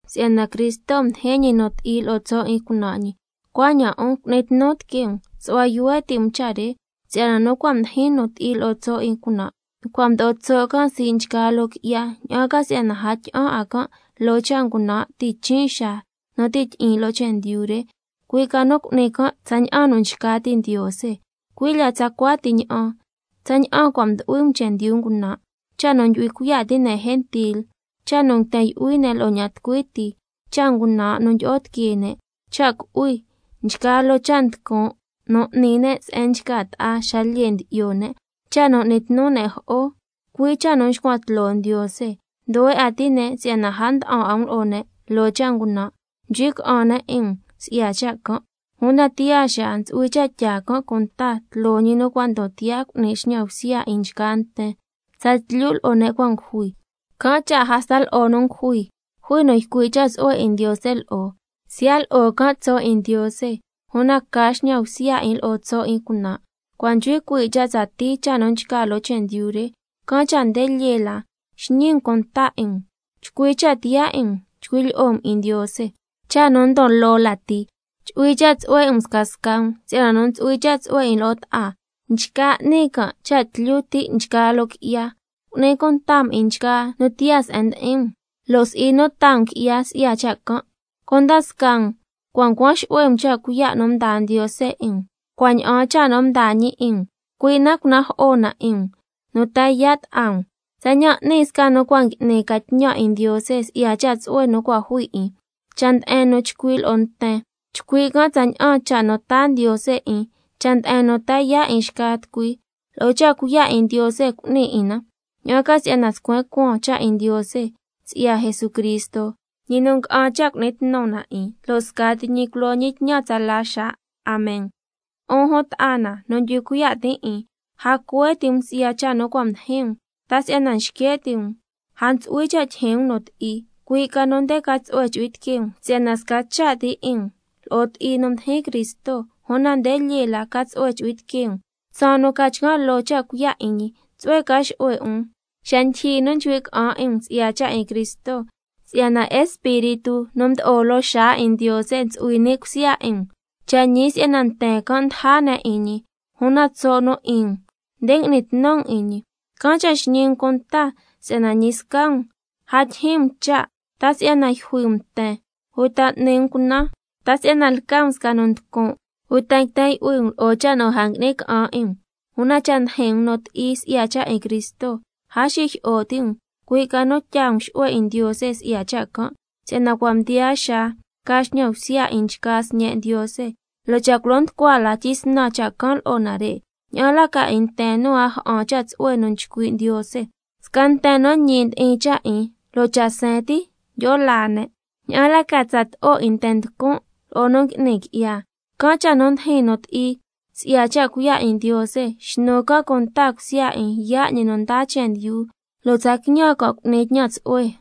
Si'yana Cristo mdijin ñi nu ti'i lo'o tso' 'in cunan' ñi, cuaña'an 'un cu'ni tnu tiquee um, su'hua yuhue ti' um cha' re, si'yana nu cua' mdijin nu ti'i lo'o tso' 'in cunan', cua' mdo'o tso' can' sii' nchgaa loo qui'ya, ña'an ca si'yana a tyi'an 'a can' loo cha' ngunan' tichin' xaa nu ti' tyi'in loo chendyu re, cui' ca nu cu'ni can' tsaña'an nu nchca ti' Ndiose. Cui' lya tsacua ti ña'an tsaña'an cua' mdu'hui um chendyu ngunan', cha' nu ndyu'hui cuiya' ti' ne' gentil: Cha' nu nguiten yu'hui ne' lo'o ña'an tucui ti, cha' ngunan' nu ndyi'o tiquee ne', cha' cu'hui, nchgaa loo cha' nducun' nu n'ni ne' se'en nchca ta'a xa lyee ndyi'yo ne', cha' nu n'ni tnu ne' jo'o, cui' cha' nu nxcuan tloo Ndiose. Nduhue 'a ti' ne' si'yana a nda'an 'a um lo'o ne' loo cha' ngunan', nchcui' ca'an ne' 'in um si'ya cha' can', una tiyaa xaa ntsu'hui cha' tyaa can' cunta tloo ñi nu cua' ndon tiyaa cu'ni xñan bsya 'in nten tsatlyu lo'o ne' cua' ngujui. Can' cha' hasta lo'o nu ngujui jui nu ycui' cha' tsu'hue 'in Ndiose lo'o, siya' lo'o can' tso' 'in Ndiose, una ca xñan bsya 'in lo'o tso' 'in cunan'. Cua' nchcui cuii' cha' tsatii cha' nu nchca loo chendyu re, can' cha' nde lyee la xñi um cunta 'in um, chcui cha' tiyaa 'in um chcui' lyi'o um 'in Ndiose. Cha' nu ndon loo lati, chu'hui cha' tsu'hue 'in um scasca um, si'yana nu ntsu'hui cha' tsu'hue 'in lo'o ta'a, nchca n'ni can' cha' tlyu ti' nchgaa loo qui'ya. Cu'ni cunta um 'in nchgaa nu tiyaa se'en ndi'in um, lo' si'i nu taa um qui'ya si'ya cha' can'. Cunda scaa um cua' ncuan xu'hue um cha' cuiya' nu mdaa Ndiose 'in um, cua' ña'aan cha' nu mdaa ñi 'in um, cui' na cunajo'o na 'in um nu ta yaa' ta'a um, tsaña'an n'ni sca nu cua' ngui'ni ca tñan 'in Ndiose si'ya cha' tsu'hue nu cua' jui 'in. Cha' nde'en nu chcui' lo'o nten, chcui' can' tsaña'an cha' nu taa Ndiose 'in, cha' nde'en nu ta yaa' 'in xca tucui, lo'o cha' cuiya' 'in Ndiose cu'ni 'in na, ña'an ca si'yana scuen cuaan cha' 'in Ndiose si'ya Jesucristo, ñi nu nga'an cha' cu'ni tnu na 'in, lo' scati ñi culo ñi tñan tsala xaa. Amen. 'Un jun ta'a na nu ndyu'hui cuiya' tin' 'in, a cuhue ti' um si'ya cha' nu cua' ndijin um, ta si'yana xque' ti' um a ntsu'hui cha' tyijyin um nu ti'i, cui' ca nu nde ca tsu'hue chu'hui tiquee um, si'yana sca cha' ti 'in um lo'o ti'i nu mdijin Cristo, una nde lyee la ca tsu'hue chu'hui tiquee um tsaan nu ca chcan' loo cha' cuiya' 'in ñi. Tsu'hue ca xu'hue um xa ndyijyi nu chcui' ca'an 'in um si'ya cha' 'in Cristo, si'yana Espíritu nu mdo'o loo xaa 'in Ndiose ntsu'hui ni' cusya 'in um. Cha' ñi si'yana nten can' ndaja 'in ñi, una tso' nu 'in um nde ngui'ni tnu um 'in ñi. Can' cha' xñi um cunta si'yana ñi sca um a tyijyin um cha', ta si'yana yjui um nten, uta m'ni um cunan, ta si'yana lca um sca nu nducun', uta nguiten yu'hui um lo'o cha' nu a ngui'ni ca'an 'in um. Una cha' ndijin um nu ti'i si'ya cha' 'in Cristo, a xijyi'o ti' um, cui' ca nu tyaa um xu'hue 'in Ndiose si'ya cha' can'. Si'yana cua' mdiyaa xaa ca xñan bsya 'in nchgaa sñe' Ndiose, lo' cha' culo nducua la tyisnan cha' can' lo'o nare', ¿ña'an la ca 'in nten nu a ja'an cha' tsu'hue nu nchcui' Ndiose? —Sca nten nu ñi ndi'in cha' 'in, lo' cha' seen ti tyi'o laa ne', ¿ña'an la ca tsato'o 'in nten nducun' lo'o nu ngui'ni qui'ya—? Can' cha' nu ndijin nu ti'i si'ya cha' cuiya' 'in Ndiose, xnu can' cunta cusya 'in yaa' ñi nu ndaa chendyu, lo' tsa quiñan can' cu'ni tñan tsu'hue.